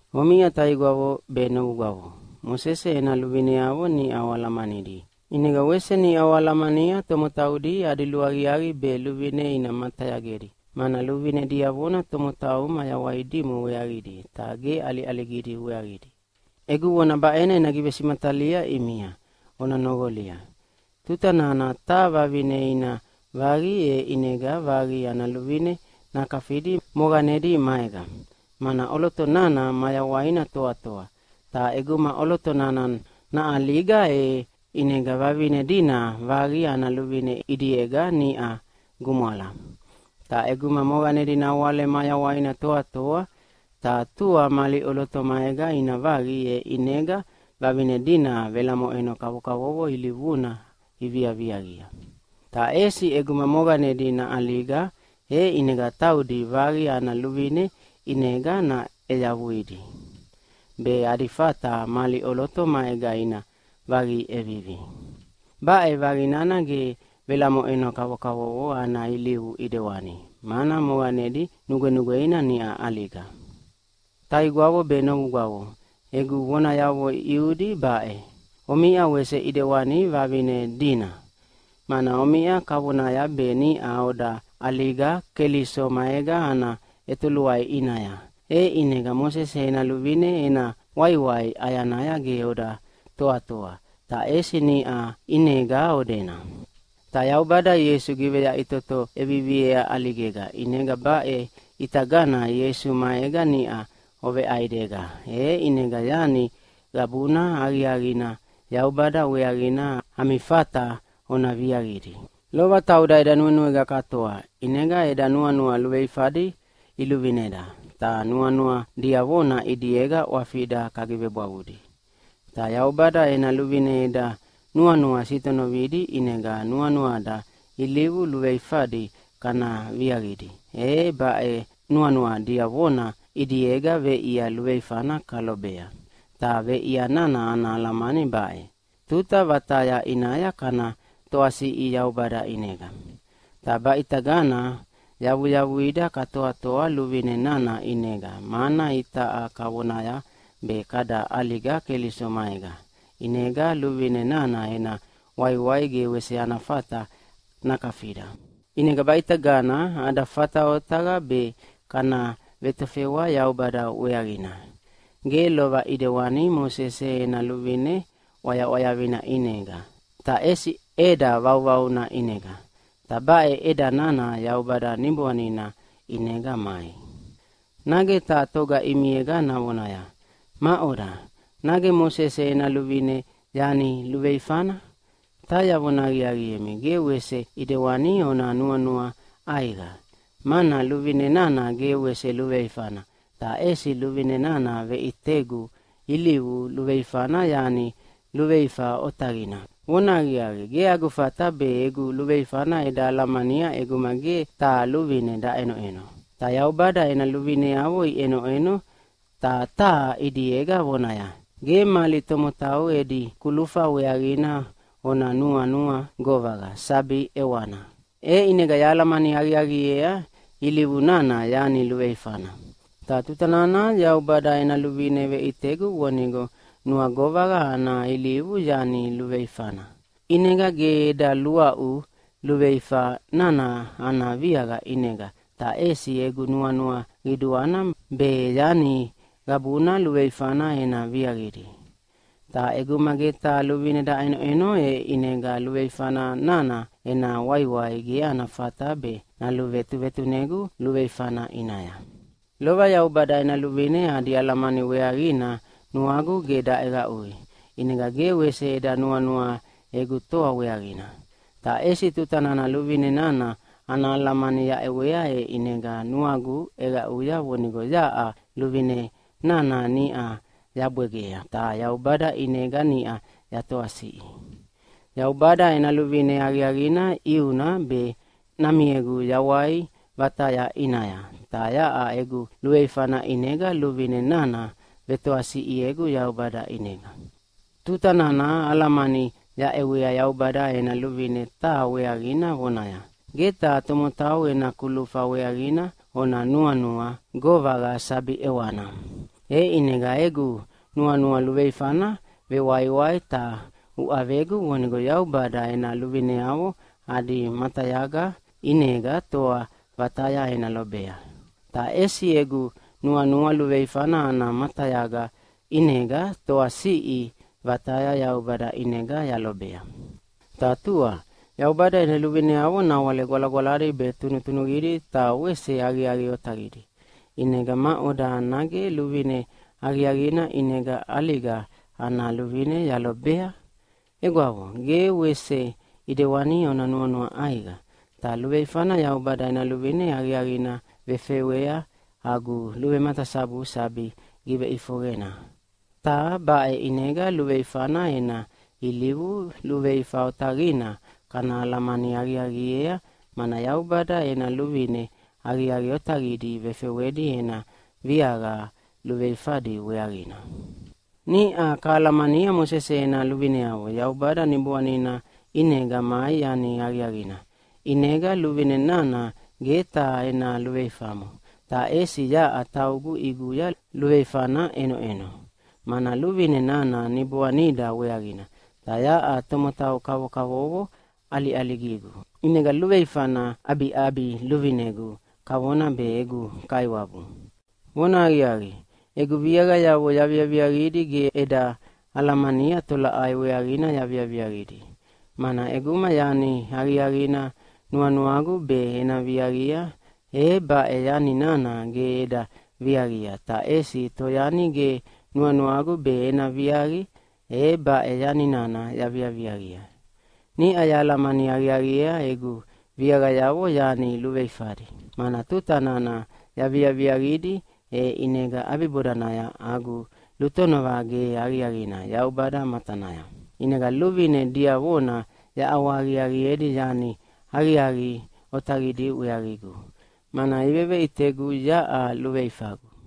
Omiʼa taigwavo be novugwavo, Mosese ena luvineavo niʼa oalamanidi, ʼinega wese niʼa oalamania tomotaudi adi luaqiaqi be luvine ina matayagedi, mana luvine diavona tomotau mayawai dimo weaqidi, ta ge ʼaliʼaligidi weaqidi. Egu vona baʼena ena givesimatalia ʼimia, ona noqolia. Tuta nana taha vavine ina vaqi, e ʼinega vaqi ana luvine nakafidi moqanedi maega, mana ʼoloto nana mayawaina toatoa. Ta ʼeguma ʼoloto nana naʼaliga, e ʼinega vavine dina vaqi ana luvine ʼidiega niʼa gumwala. Ta ʼeguma moqanedi nawale mayawaina toatoa, ta tua mali ʼoloto maega ina vaqi, e ʼinega vavine dina velamoʼeno kavokavovo ilivuna iviaviaqia. Ta ʼesi ʼeguma moqanedi naʼaliga, e ʼinega taudi vaqi ana luvine ʼinega naʼeyavuidi, be adi fata mali ʼoloto maega ina vaqi ʼevivi. Baʼe vaqi nana ge velamoʼeno kavokavovo ana ilivu ʼidewani, mana moqanedi nugwenugweina niʼa ʼaliga. Taigwavo be novugwavo, egu vonayavo ʼiudi baʼe: Omiʼa wese ʼidewani vavine dina. Mana omiʼa kavonaya be niʼa oda ʼaliga Keliso maega ana ʼetoluai ʼinaya, e ʼinega Mosese ena luvine ena waiwai ʼayanaya ge oda toatoa, ta ʼesi niʼa ʼinega odena. Ta Yaubada Ieisu giveyaʼitoto ʼeviviea ʼaligega, ʼinega baʼe ʼitagana Ieisu maega niʼa oveʼaidega, e ʼinega yani qabuna aqiaqina Yaubada weaqina ami fata ona viaqidi. Lova tauda eda nuenuega katoa, ʼinega eda nuanua luveifadi iluvineda, ta nuanua diavona ʼidiega ʼwafida kagivebwavudi. Ta Yaubada ena luvine eda nuanua sitonovidi ʼinega nuanuada ilivu luveifadi kana viaqidi, e baʼe nuanua diavona ʼidiega veʼia luveifana kalobea, ta veʼia nana ana alamani baʼe: Tuta vataya ʼinaya kana toasiʼi Yaubada ʼinega. Ta baʼitagana yavuyavuida katoatoa luvine nana ʼinega, mana itaʼa kavonaya be kada ʼaliga Keliso maega, ʼinega luvine nana ena waiwai ge wese ana fata nakafida. ʼInega baʼitagana ada fata otaqa be kana vetofewa Yaubada weaqina. Ge lova ʼidewani Mosese ena luvine ʼwayaʼwayavina ʼinega, ta ʼesi ʼeda vauvauna ʼinega, ta baʼe ʼeda nana Yaubada Niboanina ʼinega mai. Nage taha toga ʼimiega navonaya, “Maʼoda, nage Mosese ena luvine yani luveifana?” Ta yavona aqiaqiemi, ge wese ʼidewani ona nuanua ʼaiqa! Mana luvine nana ge wese luveifana, ta ʼesi luvine nana veʼitegu ilivu luveifana yani luveifa otaqina. Vonahaqiaqi, ge agu fata be egu luveifana eda alamania ʼeguma ge taha luvine daʼenoʼeno. Ta Yaubada ena luvineavo iʼenoʼeno ta taha ʼidiega vonaya, “Ge mali tomotau edi kulufa weaqina ona nuanua govaqa sabi ʼewana.” E ʼinega yahalamani aqiaqiea ilivu nana yani luveifana. Ta tuta nana Yaubada ena luvine veʼitegu vonigo nuagovaqa ana ilivu yani luveifana, ʼinega ge eda luaʼu luveifa nana ana viaqa ʼinega, ta ʼesi egu nuanua qiduana be yani qabuna luveifana ena viaqidi. Ta ʼeguma ge taha luvine daʼenoʼeno e ʼinega luveifa nana ena waiwai ge ana fata be naluvetuvetunegu luveifana ʼinaya. Lova Yaubada ena luvine adi alamani weaqina nuagu ge daʼeqaʼui, ʼinega ge wese eda nuanua egu toa weaqina. Ta ʼesi tuta nana luvine nana ana alamani yaʼewea e ʼinega nuagu ʼeqaʼuya vonigo yaʼa luvine nana niʼa yabwegea, ta Yaubada ʼinega niʼa yatoasiʼi. Yaubada ena luvine aqiaqina ʼiuna be namiegu yawai vataya ʼinaya, ta yaʼa egu luveifana ʼinega luvine nana vetoasiʼiegu Yaubada ʼinega. Tuta nana alamani yaʼewea Yaubada ena luvine taha weaqina vonaya, “Ge taha tomotau ena kulufa weaqina ona nuanua govaqa sabi ʼewana!” E ʼinega egu nuanua luveifana vewaiwai ta uʼavegu vonigo Yaubada ena luvineavo adi matayaga ʼinega toa vataya ena lobea. Ta ʼesi egu nuanua luveifana ana matayaga ʼinega toasiʼi vataya Yaubada ʼinega yalobea. Ta tua, Yaubada ena luvineavo nawale gwalagwaladi be tunutunuqidi ta wese aqiaqi otaqidi. ʼInega maʼoda, nage luvine aqiaqina ʼinega ʼaliga ana luvine yalobea? Egwavo, ge wese ʼidewani ona nuanua ʼaiqa! Ta luveifana Yaubada ena luvine aqiaqina vefewea agu luvematasabu sabi giveʼifoqena. Ta baʼe ʼinega luveifana ena ilivu luveifa otaqina kana alamani aqiaqiea, mana Yaubada ena luvine aqiaqi otaqidi vefewedi ena viaqa luveifadi weaqina. Niʼa kahalamania Mosese ena luvineavo Yaubada Niboanina ʼinega mai yani aqiaqina. ʼInega luvine nana ge taha ena luveifamo, ta ʼesi yaʼa taugu ʼiguya luveifana ʼenoʼeno. Mana luvine nana niboanida weaqina, ta yaʼa tomotau kavokavovo ʼaliʼaligigu, ʼinega luveifana ʼabiʼabiluvinegu kavona be egu kaiwabu. Vonahaqiaqi, egu viaqayavo yaviaviaqidi ge eda alamania tolaʼai weaqina yaviaviaqidi. Mana ʼeguma yani aqiaqina nuanuagu be ena viaqia e baʼe yani nana ge eda viaqia, ta ʼesi toyani ge nuanuagu be ena viaqi, e baʼe yani nana yaviaviaqia. Niʼa yahalamani aqiaqiea egu viaqayavo yani luveifadi. Mana tuta nana yaviaviaqidi, e ʼinega ʼabibodanaya agu lutonova ge aqiaqina Yaubada matanaya. ʼInega luvine diavona yaʼawahaqiaqiedi yani aqiaqi otaqidi weaqigu, mana iveveʼitegu yaʼa luveifagu.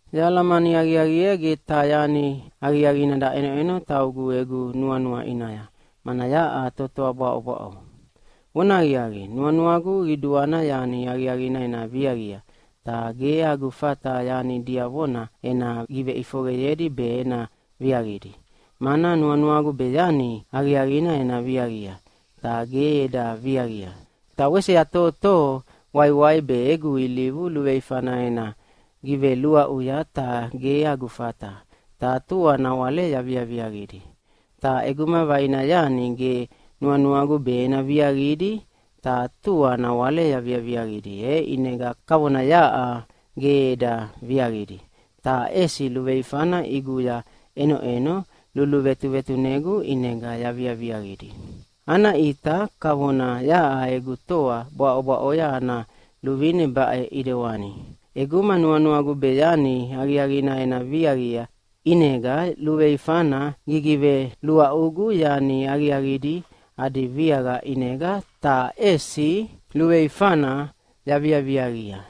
Yahalamani aqiaqiea ge taha yani aqiaqina daʼenoʼeno taugu egu nuanua ʼinaya, mana yaʼa totoa bwaʼobwaʼo. Vonahaqiaqi, nuanuagu qiduana yani aqiaqina ena viaqia, ta ge agu fata yani diavona ena giveʼifoqeyedi be ena viaqidi. Mana nuanuagu be yani aqiaqina ena viaqia, ta ge eda viaqia. Ta wese yatohotoho waiwai be egu ilivu luveifana ena giveluaʼuya, ta ge agu fata, ta tua nawale yaviaviaqidi. Ta ʼeguma vaina yani ge nuanuagu be ena viaqidi, ta tua nawale yaviaviaqidi, e ʼinega kavona yaʼa ge eda viaqidi, ta ʼesi luveifana ʼiguya ʼenoʼeno luluvetuvetunegu ʼinega yaviaviaqidi. Ana ʼita kavona yaʼa egu toa bwaʼobwaʼoya ana luvine baʼe ʼidewani: ʼEguma nuanuagu be yani aqiaqina ena viaqia, ʼinega luveifana gigiveluaʼugu yani aqiaqidi adi viaqa ʼinega, ta ʼesi luveifana yaviaviaqia.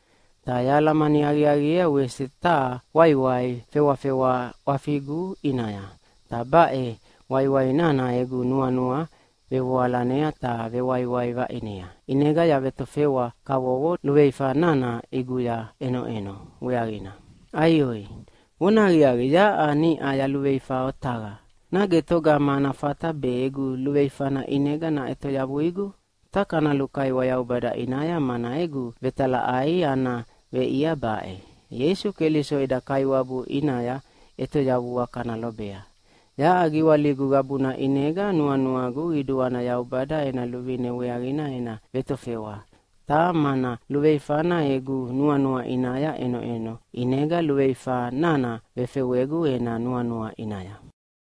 Ta yahalamani aqiaqiea wese taha waiwai fewafewa ʼwafigu ʼinaya, ta baʼe waiwai nana egu nuanua vevoalanea ta vewaiwai vaʼinea, ʼinega yavetofewa kavovo luveifa nana ʼiguya ʼenoʼeno weaqina. Aioi! Vonahaqiaqi, yaʼa niʼa yaluveifa otaqa! Nage togama ana fata be egu luveifana ʼinega naʼetoyavuigu? Ta kana lukaiwa Yaubada ʼinaya, mana egu vetalaʼai ana veʼia baʼe: Ieisu Keliso eda Kaiwabu ʼinaya ʼetoyavua kana lobea. Yaʼa giwaligu qabuna ʼinega nuanuagu qiduana Yaubada ena luvine weaqina ena vetofewa, ta mana luveifana egu nuanua ʼinaya ʼenoʼeno, ʼinega luveifa nana vefewegu ena nuanua ʼinaya.